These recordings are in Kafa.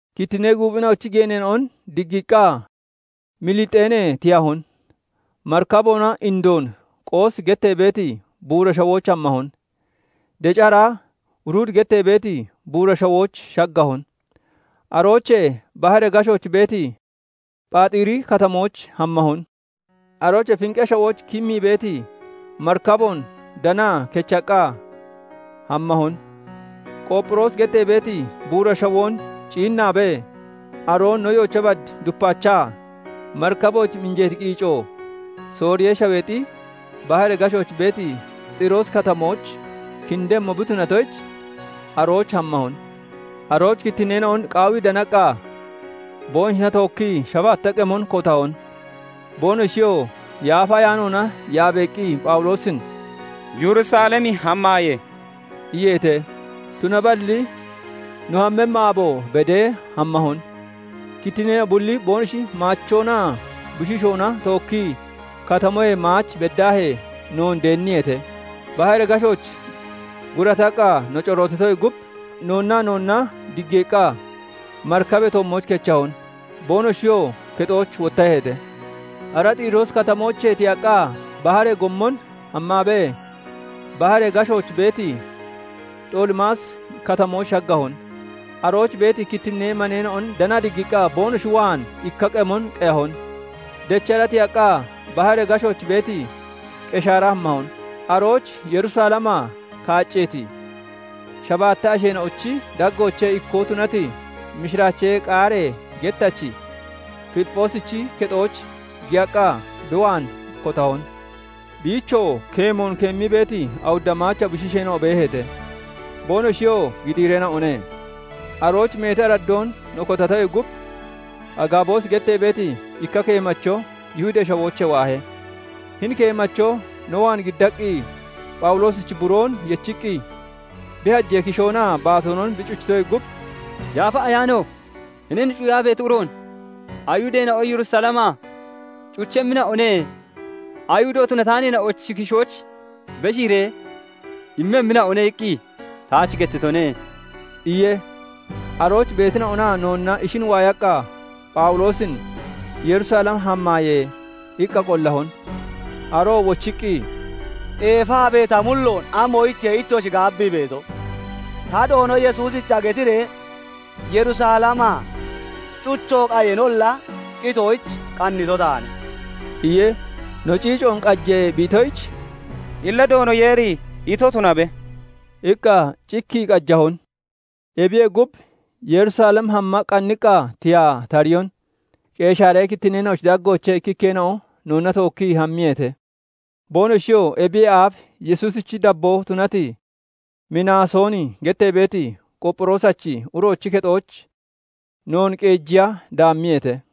Kittinnee guuphina'ochi geeneena'on diggiiqqa, Milexiinee tiyahon. Marikaboona indoon Qoosi gettee beeti buura shawooch hammahon; deci hara Rudi gettee beeti buura shawooch shaggahon; aroochee baharee gashooch beeti Phaaxiri Katamooch hammahon. Aroochee Finqee Shawooch kimmii beeti marikaboon danaa kechaqqa hammahon. Qoopphiroosi gettee beeti buura shawoon ciinnaabee, aroon no yoocha bad dupaachaa marikabooch minjeeti qiico Sooriyee Shaweexi baharee gashooch beeti Xiroosi Katamooch kindemmo bi tunatoyich arooch hammahon. Arooch kittinneena'on qaawii danaqqa, boonoshina tookkii shabaatta qemon kotahon; boonoshiyoo Yaafa Ayaanoona yaabeeqqi Phawuloosin "Yerusalem hammaaye!" iyeete. Tunaballi no hammemmi aabo bedee hammahon; kittinneena'o bulli boonoshi maachoonaa bushiishoona tookkii katamoyee maach beddaahee noon deenniyeete; baharee gashooch gurataqqa no corootitoyee gub, noonnaa noonna diggeeqqa marikabee toommooch kechahon; boonoshiyoo kexooch wottaheete. Ara Xiroosi Katamoochee tiyaqqa baharee gommon hammaabee, baharee gashooch beeti Xoolimaasi Katamooch shaggahon; arooch beeti kittinnee maneena'on danaa diggiiqqa boonoshi waan ikka qemon qeyahon. Dechara tiyaqqa, baharee gashooch beeti Qeshaara hammahon. Arooch Yerusalemaa kaacceeti shabaatta asheena'ochi daggoochee ikkoo tunati mishiraachee qaaree gettachi Filipphoosichi kexooch giyaqqa bi waan kotahon. Biichoo keemoon keemmii beeti awudda maacha bushiisheena'o beeheete; boonoshiyoo gidiireena'one. Arooch meeti araddoon no kotatoyee gub, Agaaboosi gettee beeti ikka keemacho Yihudee Shawoochee waahe. Hini keemacho no waan giddaqqi, Phawuloosichi buroon yechiqqi bi hajee kishoonaa baatoonon bi cuchitoyee gub, "Yaafa Ayaano 'Hinin cuyaa beeti uroon Ayihudeena'o Yerusalemaa cuchemmina'o ne; Ayihudo tunataaneena'ochi kishooch beshiiree immemmina'one' iqqi taach gettitone" iye. Arooch beetina'onaa noonna ishin waayaqqa, Phawuloosin "Yerusalem hammaaye!" iqqa qollahon. Aroo wochiqqi, "Eefaabee ta mulloon amoyichiye ittoshi gaabbii beeto? Ta Doono Yesuusicha getiree Yerusalemaa cucho qayeenolla, qitoyich qannito taane" iye. No ciicoon qaje bi itoyich, "Illa Doono Yeeri ito tunabe!" iqqa cikkii qajahon. Ebiyee gub, Yerusalem hamma qanniqqa tiyaa tariyon. Qeshaaree kittinneena'ochi daggoochee ikkikkeena'o noonna tookkii hammiyeete; boonoshiyoo ebiyee aaf Yesuusichi dabboo tunati Minaasooni gettee beeti Qoopphiroosachi uroochi kexooch noon qeejiya daammiyeete.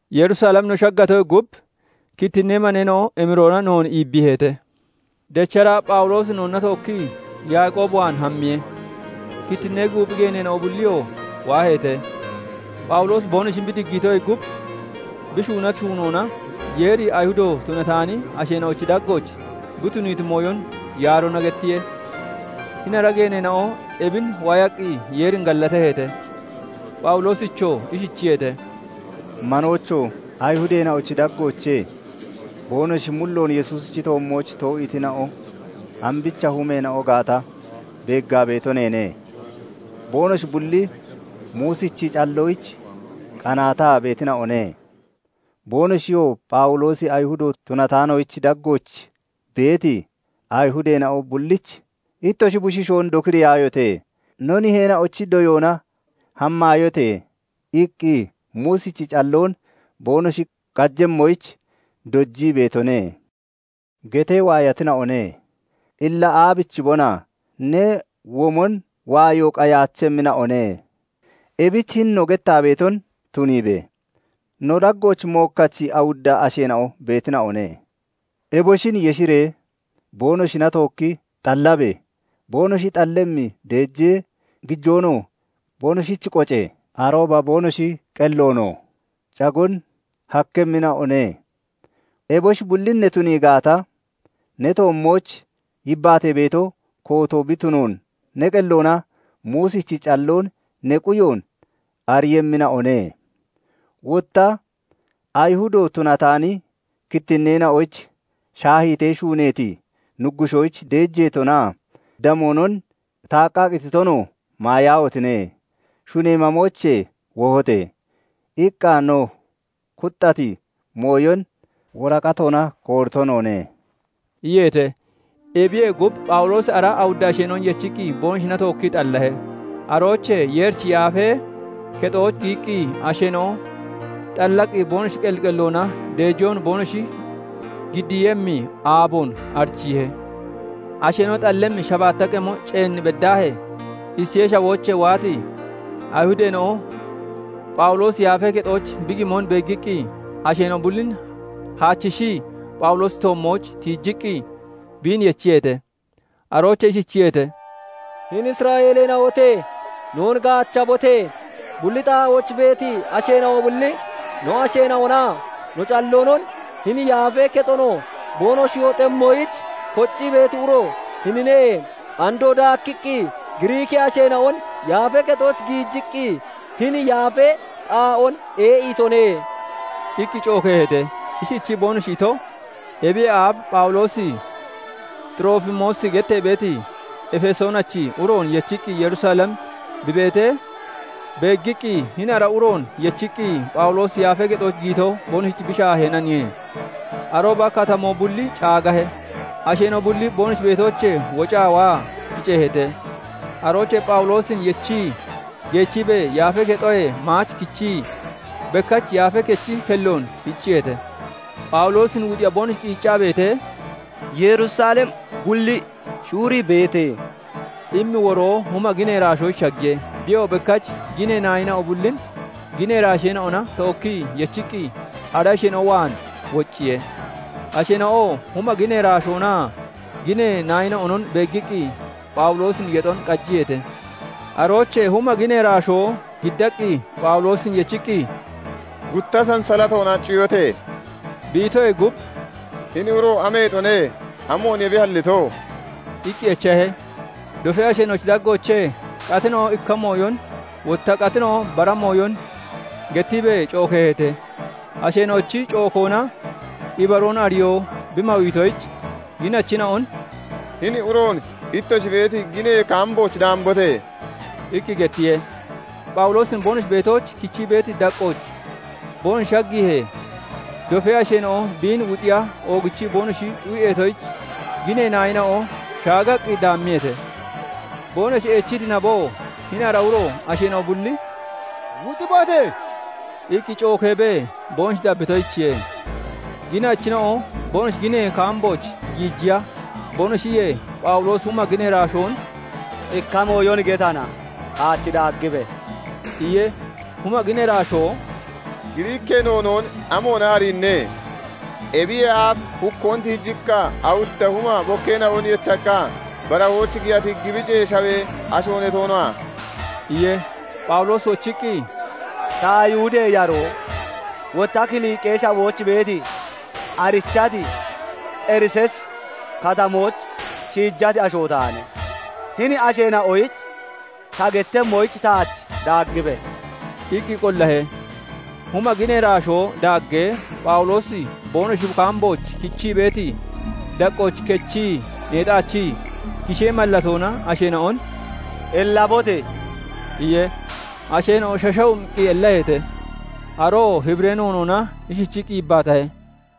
Yerusalem no shaggatoyee gub, kittinnee maneena'o emiroona noon iibbiiheete. Dechara Phawuloosi noonna tookkii Yaaqoob waan hammiye; kittinnee guuphi geeneena'o bulliyoo waaheete. Phawuloosi boonoshin bi diggiitoyee gub, bi shuunati shuunoona Yeeri Ayihudo tunataani asheena'ochi daggooch bi tuniiti mooyon yaaroona gettiye. Hini ara geeneena'o ebin waayaqqi Yeerin gallataheete. Phawuloosichoo ishichiyeete:- "Manoocho! Ayihudeena'ochi daggoochee boonoshi mulloon Yesuusichi toommooch too'iitina'o ambicha humeena'o gaata beeggaa beeto neene; boonoshi bulli Muusichi calloyich qanaataa beetina'one. Boonoshiyoo 'Phawuloosi Ayihudo tunataaneena'ochi daggooch beeti Ayihudeena'o bullich "Ittoshi bushiishoon dokiriyaayote! No niheena'ochi doyoona hamaayote!" iqqi Muusichi calloon boonoshi qajemmoyich dojii beetone' getee waayatina'one. Illa aabichibona? Ne womon waayo qayaachemmina'o ne. Ebich hini no gettaa beeton tuniibe! No daggooch mookkachi awudda asheena'o beetina'one. Eboshin yeshiree boonoshina tookki xallabe! Boonoshi xallemmi deejee gijoonoo boonoshich qoce! Arooba boonoshi qelloonoo caggoon hakkemmina'o ne. Eboshi bullin ne tunii gaata, ne toommooch yibbaatee beeto kooto bi tunoon, ne qelloona Muusichi calloon ne quyoon ariiyemmina'o ne. Wotta Ayihudo tunataani kittinneena'oyich 'Shaahiitee shuuneeti nuggushoyich deejeetonaa damoonon, taaqqaa qititonoo maayaahotine! Shunee mamoochee wohote!' iqqa no kuxxati mooyon woraqatoona koorito noone" iyeete. Ebiyee gub, Phawuloosi ara awudda asheena'on yechiqqi boonoshina tookkii xallahe. Aroochee Yeerichi yafee kexooch giyiqqi asheena'o xallaqqi boonoshi qelli qelloona deejoon boonoshi giddiiyemmi aaboon arichiihe. Asheena'o xallemmi shabaatta qemo ceen beddaahee, Isiyee Shawoochee waati Ayihudeena'o Phawuloosi Yaafee Kexooch bi beemon beeggiqqi, asheena'o bullin haachishii Phawuloosichi toommooch tiijiqqi biin yechiyeete; aroochee ishichiyeete:- "Hini Isra'eeleena'ote! Noon gaachabote! Bulli xaa'ooch beeti asheena'o bulli no asheena'onaa no calloonon, hini Yaafee Kexonoo boonoshi hoxemmoyich koccii beeti uro hinine. Andoo daakkiqqi Giriikee asheena'on Yaafee Kexooch giijiqqi, hini yaafee xaa'oon ee'iitone" iqqi cookeeheete. Ishichii boonoshi ito, ebiyee aaf Phawuloosi Xiroofimoosi gettee beeti Efesoonachi uroon yechiqqi Yerusalem bi beetee beeggiqqi, hini ara uroon yechiqqi Phawuloosi Yaafee Kexooch giyito boonoshich bi shaaheenaniye. Arooba katamoo bulli caagahe; asheena'o bulli boonoshi beetoochee wocaa waa kiceeheete; aroochee Phawuloosin yechii geechiibee Yaafee Kexoyee maach kichii, bekkach Yaafee Kechi kelloon hicciyeete. Phawuloosin wuxiya boonoshi qiiccaa beetee, " 'Yerusalem bulli shuurii beete' immi woroo huma ginee iraashoyich shaggiye. Biyoo bekkach ginee naayina'o bullin ginee iraasheena'ona tookkii yechiqqi ara asheena'o waan wocciye. Asheena'oo huma ginee iraashoonaa ginee naayina'onon beeggiqqi, Phawuloosin yexon qajiyeete. Aroochee huma ginee iraashoo giddaqqi Phawuloosin yechiqqi, "Gutta sansalatoona cuyote!" bi itoyee gub, "Hini uro ameexone? Amooniye bi hallito?" iqqi echahe. Dofee asheena'ochi daggoochee qatina'o ikka mooyon, wotta qatina'o bara mooyon gettiibee cookeeheete. Asheena'ochi cookoona ibaroon ariyoo bi mawiitoyich, ginachina'on "Hini uroon ittoshi beeti ginee kaambooch daambote!" iqqi gettiye. Phawuloosin boonoshi beetooch kichii beeti daqqooch boonoshi shaggiihee, dofee asheena'o biin wuxiya oogichii boonoshi xu'eetoyich, ginee naayina'o shaagaqqi daammiyeete. Boonoshi eechiti naboo, hini ara asheena'o bulli "Wuxibote!" iqqi cookeebee boonoshi dabbitoyichiye. Ginachina'o boonoshi ginee kaambooch giijiya boonoshi iyee, Phawuloosi huma ginee iraashoon "Ikka mooyon getana, taach daaggibe!" iye. Huma ginee iraashoo "Giriikee noonoon amoona ariinne? Ebiyee aaf hukkoon tiijiqqa, awudda huma bokkeena'on yechaqqa barahooch giyati Gibicee Shawee asho ne toona?" iye. Phawuloosi wochiqqi, "Ta Ayihudee yaroo, wotta Kiliqee Shawooch beeti, arichati Xeriseesi Katamooch shiijati asho taane. Hini asheena'oyich ta gettemmoyich taach daaggibe!" iqqi qollahe. Huma ginee iraashoo daaggee, Phawuloosi boonoshi kaambooch kichii beeti daqqooch kechii neexaachii, kishee mallatoona asheena'on "Ellabote!" iye. Asheena'o shashawumiqqi ellaheete. Aroo Hibiree noonoona ishichiqqi yibbaatahe:-